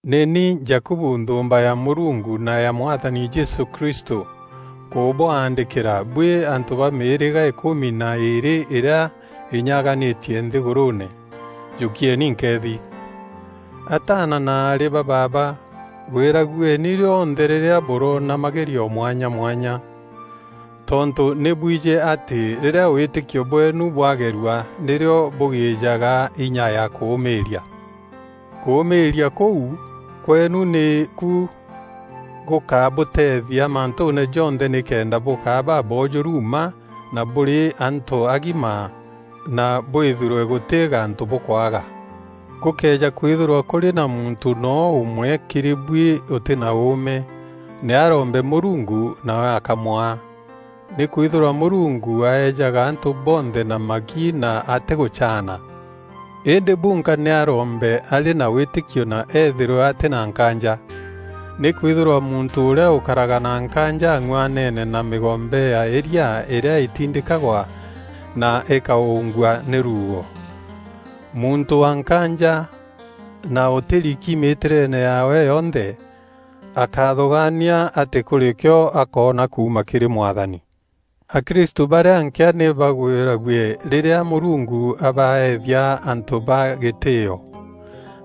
Nî ni Jakubu nthûûmba ya Mûrungu na ya Mwathani Jesû Kristû, nkûbwaandîkîra buî antû ba mîîrîga îkûmi na îîrî îrîa înyaganîtie nthîgûrûûne: Jûkieni nkeethi. Ataana na aarî ba baaba, gwîragueni rîonthe rîrîa bûroona magerio mwanya mwanya. Tontû nî bwijî atî rîrîa wîtîkio bweenu bwagerua nîrîo bûgîîjaga inya ya kûûmîîria. Kûûmîîria kûu kweenu nî ku gûkabûteethia mantûûne jonthe nîkenda bûkaa baboojûru mma na bûrî antû agima na bwîthîrwe gûtî gantû bûkwaga. Gûkëeja kwîthîrwa kûrî na muntû noo ûmwe kîrî buî ûtî na ûûme, nî arombe Mûrungu nawe akamwaa. Nîkwîthîrwa Mûrungu aejaga antû bonthe na magi na atîgûcaana. Îndî bunka nî arombe arî na wîtîkio na ethîrwe atî na nkaanja. Nîkwîthîrwa muntû ûrîa ûkaraga na nkaanja ang'uanene na mîgombe ya îria îrîa îtindîkagwa na îkaûûngua nî ruuo. Muntû wa nkaanja na ûtîriki mîtîreene yaawe yonthe, akáthûgaania atî kûrî kîo akoona kuuma kîrî Mwathani. Akrisû barîa nkîa nî bagwîrague rîrîa Mûrungu abaeethia antû ba gîtîîo,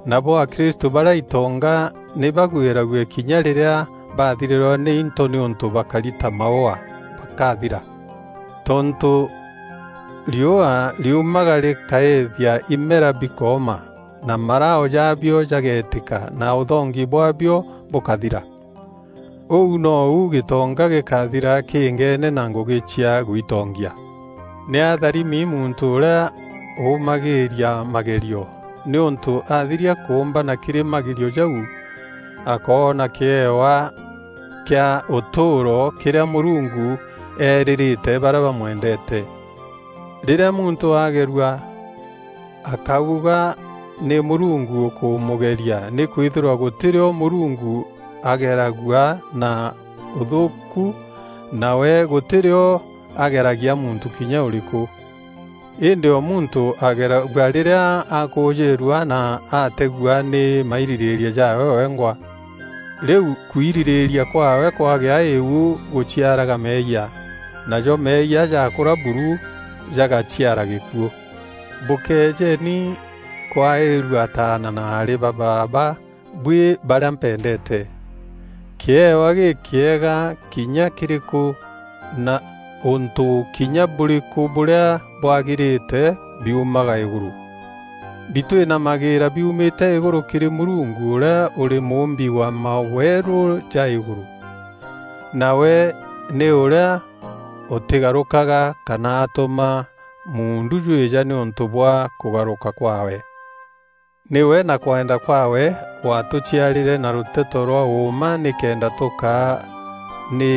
nabo akristû barîa itonga nî bagwîrague kinya rîrîa baathirîrwa nî into nîûntû bakari ta maûa, bakathira. Tontû riûa riumaga rîkaîîthia imera bikooma na marao jaabio jagetîka na ûthongi bwaabio bûkathira. Ûu nou gîtonga gîkathira kîîngeene na ngûgî cia gwitongia. Nî atharimi muntû ûrîa ûûmagîîria magerio, nîûntû athiria kûûmbana kîrî magerio jau, akoona kîewa kîa ûtûûro kîrîa Mûrungu eerîîrîte barîa bamwendeete. Rîrîa muntû agerua, akáuga nî Mûrungu ûkûmûgeria nîkwîthîrwa gûtî rîo Mûrungu ageragua na ûthûûku na we gûtî rîo ageragia muntû kinya ûrîkû. Îndî o muntû ageragua rîrîa akujîîrua na ategua nî mairîrîîria jaawe wengwa. Rîu kwirîrîîria kwaawe kwagea îu gûciaraga meeyia, najo meeyia jaakûra buru jagaciara gîkuû. Bûkéejeeni kwaîrua ataana na aarî ba baaba buî barîa mpendeete. Kîewa gîkîega kinya kîrîkû na ûntû kinya bûrîkû bûrîa bwagîrîte biumaga îgûrû. Bitwînamagîîra biumîte îgûrû kîrî Mûrungu ûrîa ûrî Mûûmbi wa mawerû ja îgûrû, na We nî ûrîa ûtîgarûkaga kana atûma muundu jwîja nîûntû bwa kûgarûka kwaawe. Nîwe na kwenda kwaawe watûciarîre na rûteto rwa ûûma nîkenda tûkaa nî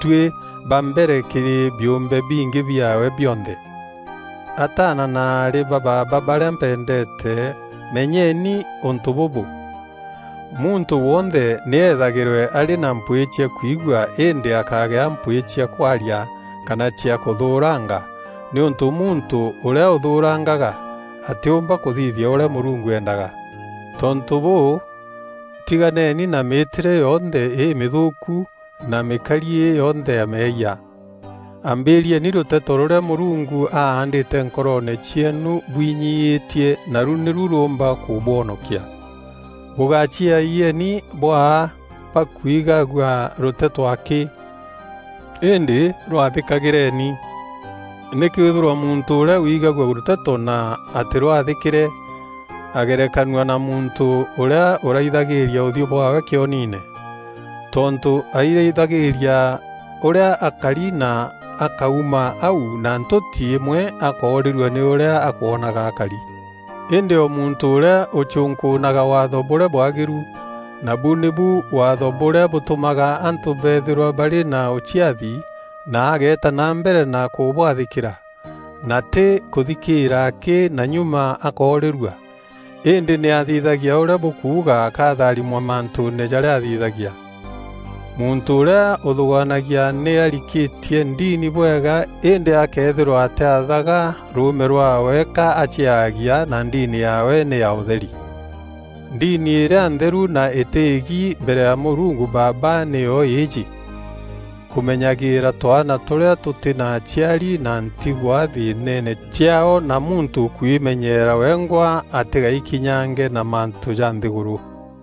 tuî ba mbere kîrî biûmbe bingî biaawe bionthe. Ataana na aarî ba baaba barîa mpendeete menyeni ûntû bûbû: muntû wonthe nî eethagîrwe arî na mpwîî cia kwigua îndî akagîa mpwîî cia kwaria kana cia kûthûûranga nîûntû muntû ûrîa ûthûûrangaga, atîûmba kûthithia ûrîa Mûrungu eendaga. Tontû bûû, tiganeni na mîîtîre yonthe îmîthûûku na mîkariî yonthe ya meeyia. Ambîrieni rûteto rûrîa Mûrungu aandîte nkoroone cieenu bwinyiîtie, naru nîru rûûmba kûbwonokia. Bûgaciayieni bwaa bakwigagua rûteto akî, îndî rwathîkagîreeni. Nîkwîthîrwa muntû ûrîa wigaagua rûteto na atîrwathîkîre, agerekanua na muntû ûrîa ûraithagîîria ûthiû bwaawe kîoniine. Tontû airaithagîîria ûrîa akari na akauma au na ntûti îmwe akoorîrua nî ûrîa akwonaga akari. Îndî o muntû ûrîa ûcunkûûnaga waatho bûrîa bwagîru, nabu nîbu waatho bûrîa bûtûmaga antû beethîrwa barî na ûciathi, na ageeta na mbere na kûbwathîkîra, na tî kûthikîîra akî na nyuma akoorîrua, îndî nî athithagia ûrîa bûkuuga akatharimwa mantûûne jarîa athithagia. Muntû ûrîa ûthûgaanagia nî arikîtie ndini bwega îndî akëethîrwa atîathaga rûûme rwaawe ka aciaagia na ndini yaawe nî ya ûtheri. Ndini îrîa ntheru na îtî îgi mbere ya Mûrungu Baaba nîyo îîjî: kûûmenyagîîra twaana tûrîa tûtî na aciari na ntigwa thîînene ciaao na muntû kwimenyeera wengwa atîgaikinyange na mantû ja nthîgûrû.